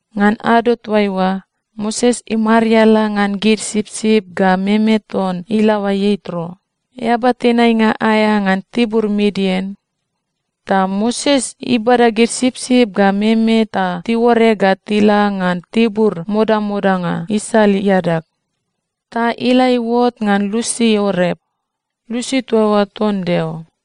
Ngan ado toaiua, Moses imariala ngan gid sipsip ga meme ton ilaoa Ietro, eaba tenainga aea ngan tibur Midian. Ta Moses ibada gid sipsip ga meme ta tiuore ga tila ngan tibur modamodanga isal iadag. Ta ila iuot ngan lusi Orep. Lusi toa oa ton Deo.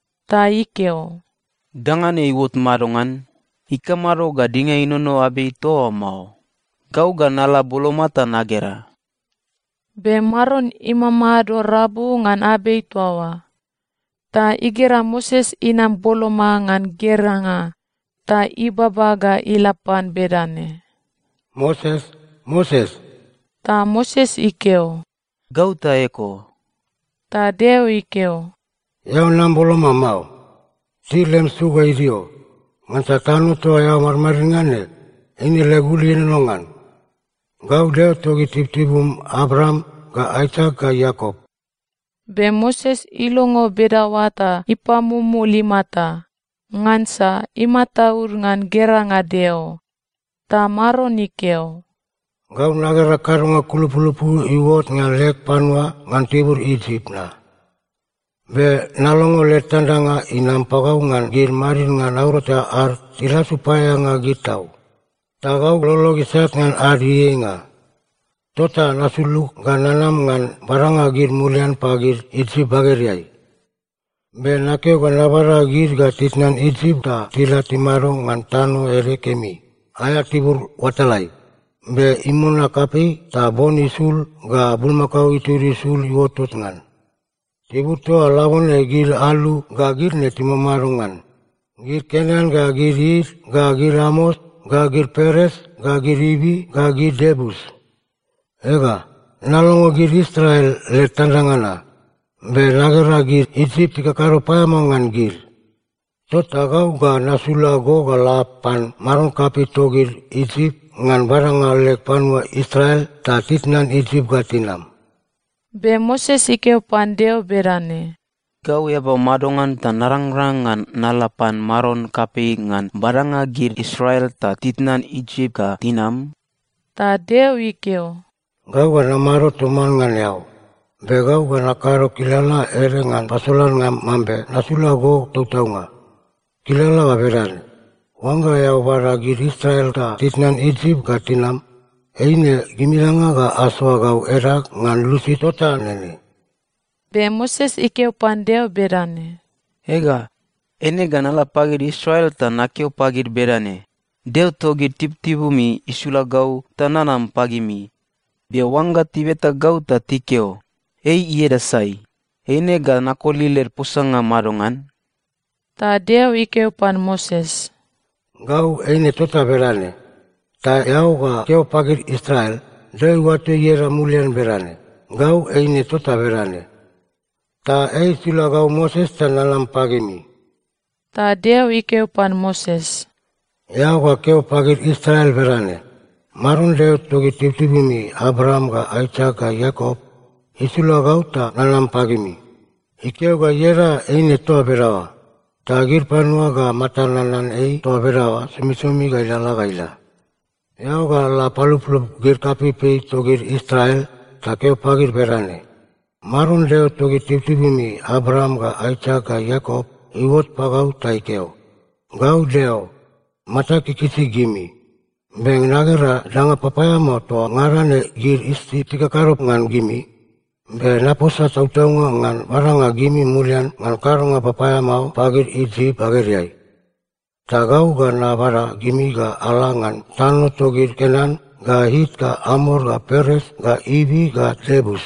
Ta ikeo, “Danga ne iuot madongan? Ikamado ga dinga inono abei toa oa mao? Gau ga nala boloma ta nagera.” Be Maron imamado rabu ngan abei toa oa, ta igera Moses inam boloma ngan geranga, ta ibaba ga ila pan bedane, “Moses, Moses!” Ta Moses ikeo, “Gau ta eko.” Ta Deo ikeo, “Eao nam boloma mao. Til lem su ga idio. Ngansa tano toa eao madmadid ngan ne, eine leg ul ienono ngan. Gau Deo togid tibutibum Abraam ga Aisak ga Iakop.” Be Moses ilongo bedaoa ta ipamumul imata, ngansa imataud ngan geranga Deo. Ta Maron ikeo, “Gau nagera kadonga kulupulupu iuot ngan leg panua ngan tibur Isip na. Be nalongo led tandanga inam pagau ngan gid madidnga naurata ad tilasu paeaeanga gid tau. Ta gau lolog isat ngan ad ieieinga. Tota nasulug ga nanam ngan badanga gid mulian pagid Isip bagedeai. Be nakeo ga nabada gid ga titnan Isip ta tila timado ngan tano ede kemi, aea tibur oatalai, be imona kapei ta bon isul ga bulmakao itud isul iuotot ngan. Tibur toa oa labone gid alu ga gid ne timamado ngan: gid Kenan ga gid It ga gid Amor ga gid Peres ga gid Ivi ga gid Iebus. Ega, nalongo gid Israel led tandanga na, be nagera gid Isip tikakado paeamao ngan gid. Tota gau ga nasula go ga la pan maron kapei togid Isip ngan badanga leg panua Israel ta titnan Isip ga tinam.” Be Moses ikeo pan Deo bedane, “Gau eaba madongan ta narangrang ngan nala pan maron kapei ngan badanga gid Israel ta titnan Isip ga tinam?” Ta Deo ikeo, “Gau ga namado toman ngan eao. Be gau ga nakado kilala ede ngan pasolannga mambe nasula go tautaunga. Kilala ga bedane: Oangga eao bada gid Israel ta titnan Isip ga tinam, eine gimingada ga asoa gau edag ngan lusi tota nene.” Be Moses ikeo pan Deo bedane, “Ega, eine ga nala pagid Israel ta nakeo pagid bedane, ‘Deo togid tibutibumi isula gau ta nanam pagimi,’ be oangga tibeta gau ta tikeo, ‘Ei ieda sai?’ eine ga nakoli led posanga madongan?” Ta Deo ikeo pan Moses, “Gau Eine Tota Bedane. Ta eao ga keo pagid Israel, ‘Deo iuato ieda mulian bedane: Gau Eine Tota Bedane. Ta ei isula gau Moses ta nanam pagimi.’” Ta Deo ikeo pan Moses, “Eao ga keo pagid Israel bedane, ‘Maron, Deo togid tibutibumi Abraam ga Aisak ga Iakop, isula gau ta nanam pagimi. Ikeo ga ieda eine toa bedaoa, ta gid panua ga matad nanan ei toa bedaoa somisomi ga ilalala ga ila.’” “Eao ga la paluplup gid kapeipei togid Israel ta keo pagid bedane, ‘Maron, Deo togid tibutibumi Abraam ga Aisak ga Iakop, iuot pagau ta ikeo: Gau Deo, matag ikikisi gimi. Be nagera danga papaeamao toa ngada ne gid Isip tikakado ngan gimi. Be naposa tautaunga ngan badanga gimi mulian ngan kadonga papaeamao pagid Isip bagedeai. Ta gau ga nabada gimi ga ala ngan tano togid Kenan ga It ga Amor ga Peres ga Ivi ga Iebus.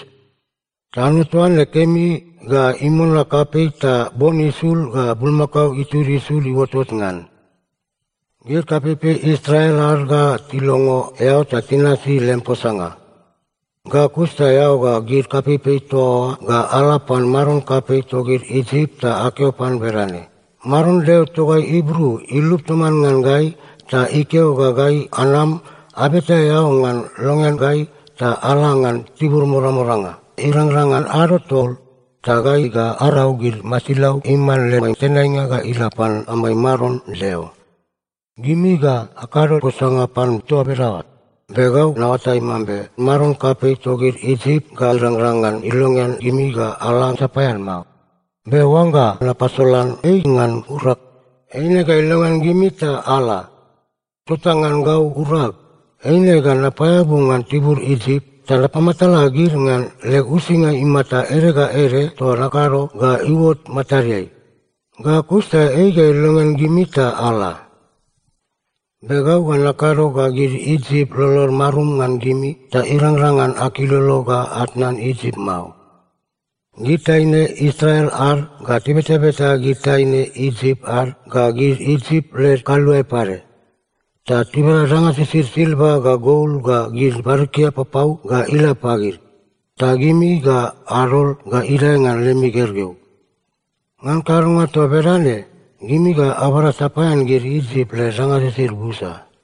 Tano toa ne kemi ga imona kapei ta bon isul ga bulmakao itud isul iuotot ngan.’ “Gid kapeipei Israel ad ga tilongo eao ta tinasi lem posanga. Ga kus ta eao ga gid kapeipei toa oa ga ala pan maron kapei togid Isip ta akeo pan bedane, ‘Maron Deo togai Ibru ilup toman ngan gai ta ikeo ga gai anam abeta eao ngan longean gai ta ala ngan tibur modamodanga, irangrang ngan ado tol, ta gai ga arau gid masilau iman lemai tenainga ga ila pan amai Maron Deo.’ Gimi ga akado posanga pan toa bedaoa, be gau naoatai mambe maron kapei togid Isip ga irangrang ngan ilongean gimi ga ala sapaean mao. Be oangga napasolan ei ngan urag, eine ga ilongean gimi ta ala. Tota ngan gau urag, eine ga napaeabu ngan tibur Isip, ta napamatala gid ngan leg uisinga imata ede ga ede toa nakado ga iuot matadeai. Ga kus ta ei ga ilongean gimi ta ala. “Be gau ga nakado ga gid Isip lolod marum ngan gimi ta irangrang ngan akilolo ga atnan Isip mao. Gid taine Israel ad ga tibetabeta gid taine Isip ad ga gid Isip led kaluae pade, ta tibada danga sisid silva ga gol ga gid barikia papau ga ila pagid. Ta gimi ga adol ga idae ngan lemi gergeu. Ngan kadonga toa bedane, gimi ga abada sapaean gid Isip led danga sisid busa.”